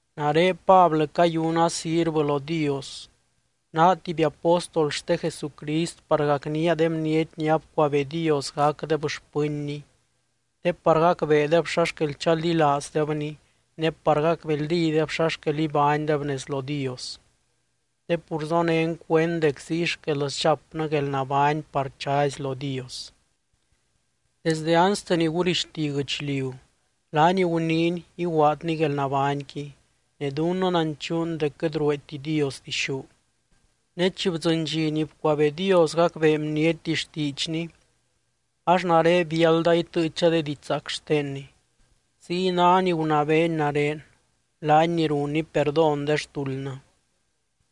Nare Pablɨ cayuna sirvɨ lo Dios, naa tuby apóstol xte Jesucrist par gacnía de bniety ni abcuabee Dios gacdeb xpɨnny te par gacbeedeb xa xquel chaldilaazdebny ne par gacbeldídeb xa xquel ibánydeb nez lo Dios, te pur zonén cuend dec ziy xquel sdxapnɨ guelnabány par chazy lo Dios. Desde anste ni gurixti guɨchliu laany guniiny iguaadny guelnabányqui, ne dunnɨ nanchuun dec quɨt rueeti Dios dixú. Ne chi bdzɨny dxi ni bcuabee Dios gacbee bniety xtiidxny, ax nare biálda itɨɨcha de didxzaac xtenny, ziy ná ni gunabeeny nare, laany ni runny perdón de xtuldnɨ.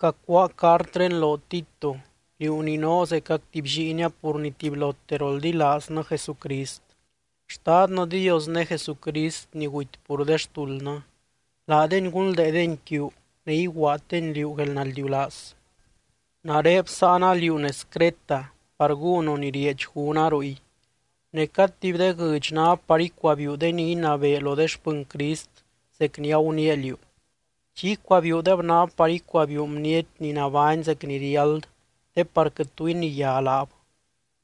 Cacuáa cartré loo, Tito, liú ni noo zecac tuby lliinia pur ni tubylote roldilaaznɨ Jesucrist. Xtadnɨ Dios ne Jesucrist ni guty pur de xtuldnɨ, laadeny gunldeedeny quiu ne iguaaddeny liú guelnaldiulaaz. Nare bsáana liú nez Creta par gúnu ni rieedx gúna ruy. Ne cad tuby de guɨdx ná par icuabiiu de ni inabee lo de xpɨny Crist zec ni aguniia liú. Chi icuabiiudeb ná par icuabiiu bniety ni nabány zec ni riáld te par quɨt tu iniyá laab,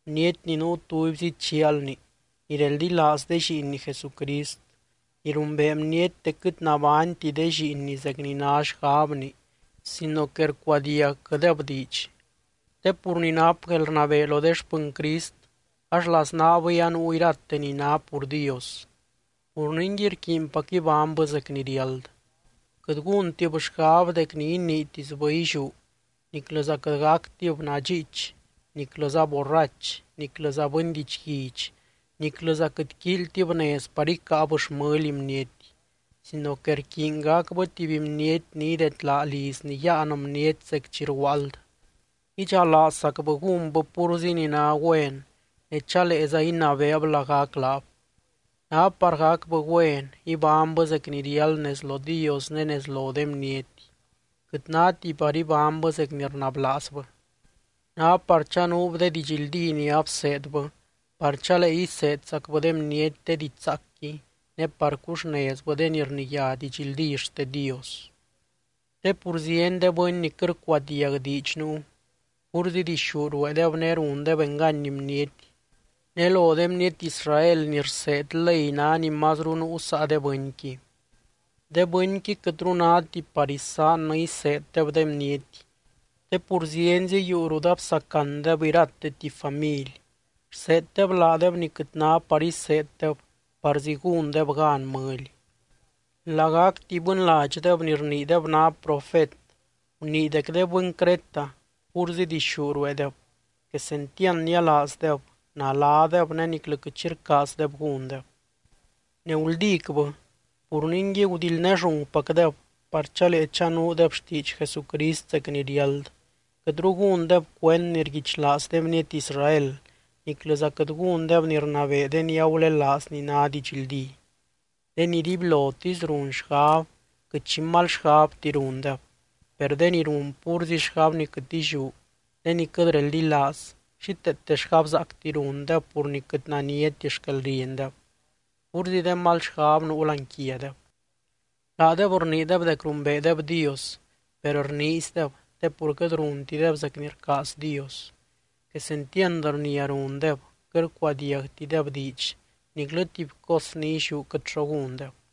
bniety ni nuu tubyzi chialni, ni reldilaaz de lliinni Jesucrist, ni rumbee bniety dec quɨt nabányti de lliinni zec ni ná xgabni sino que rcuadiagquɨdeb diidx. Te pur ni nap guelrnabee lo de xpɨny Crist ax laznaabɨy anuu irate ni ná pur Dios, pur ningui rquiinpac ibánybɨ zec ni riáld. Quɨt gúntib xgab dec ni iniitisbɨ illiú, niclɨza quɨt gactib nadxiich, niclɨza borrach, niclɨza bɨny didxguidx, niclɨza quɨt quíilytib nez par icáab xmɨly bniety sino que rquiiny gacbɨ tuby bniety ni idedlaa lizny yáan bniety zec chi rguaald, idxalaazzacbɨ gúnbɨ púrzi ni ná güen, ne chaleeza inabeeb lagac laab. Ná par gacbɨ güen, ibánybɨ zec ni riáld nez lo Dios ne nez lo de bniety, quɨt náti par ibánybɨ zec ni rnablaazbɨ. Ná par chanuub de didxldí ni abseedbɨ, par chalee iseedzacbɨ de bniety de diidx zaacqui ne par cuxnezbɨ de ni rniyá didxldí xte Dios. Te pur zieny de bɨny ni quɨt rcuadiag diidx nuu. Púrzi dixú rueedeb ne rundeb engany bniety, ne lo de bniety Israel ni rseed ley ná ni mazru nuu saa de bɨnqui. De bɨnqui quɨtru náti par isaannɨ iseeddeb de bniety, te pur zienzi yuu rut absacandeb irate tuby family, rseeddeb laadeb ni quɨt ná par iseeddeb parzi gúndeb gan mɨly. Lagac tuby bɨnladxdeb ni rniideb ná profet gunii dec de bɨny Creta púrzi dixú rueedeb, quesentiand nialaazdeb, naladeb ne niclɨ quɨt xi rcaazdeb gúndeb. Ne guldícbɨ. Pur ningui gudildnéllungpacdeb par chalee chanuudeb xtiidx Jesucrist zec ni riáld, quɨtru gúndeb cuend ni rguichlaaz de bniety Israel, niclɨza quɨt gúndeb ni rnabee de ni agulelaaz ni ná didxldí. De ni dibylotisy run xgab, quɨt xi mal xgabti rundeb. Per de ni run púrzi xgab ni quɨt illiú, de ni quɨt reldilaaz, xíteete xgabzaacti rundeb pur ni quɨt naniati xquelriendeb, púrzi de mal xgab nuu láani quiadeb. Laadeb rniideb dec rumbeedeb Dios, per rniizdeb te pur quɨt runtideb zec ni rcaaz Dios. Quesentiand rnia rundeb, quɨt rcuadiagtideb diidx, niclɨ tuby cos ni illiú quɨt xo gúndeb.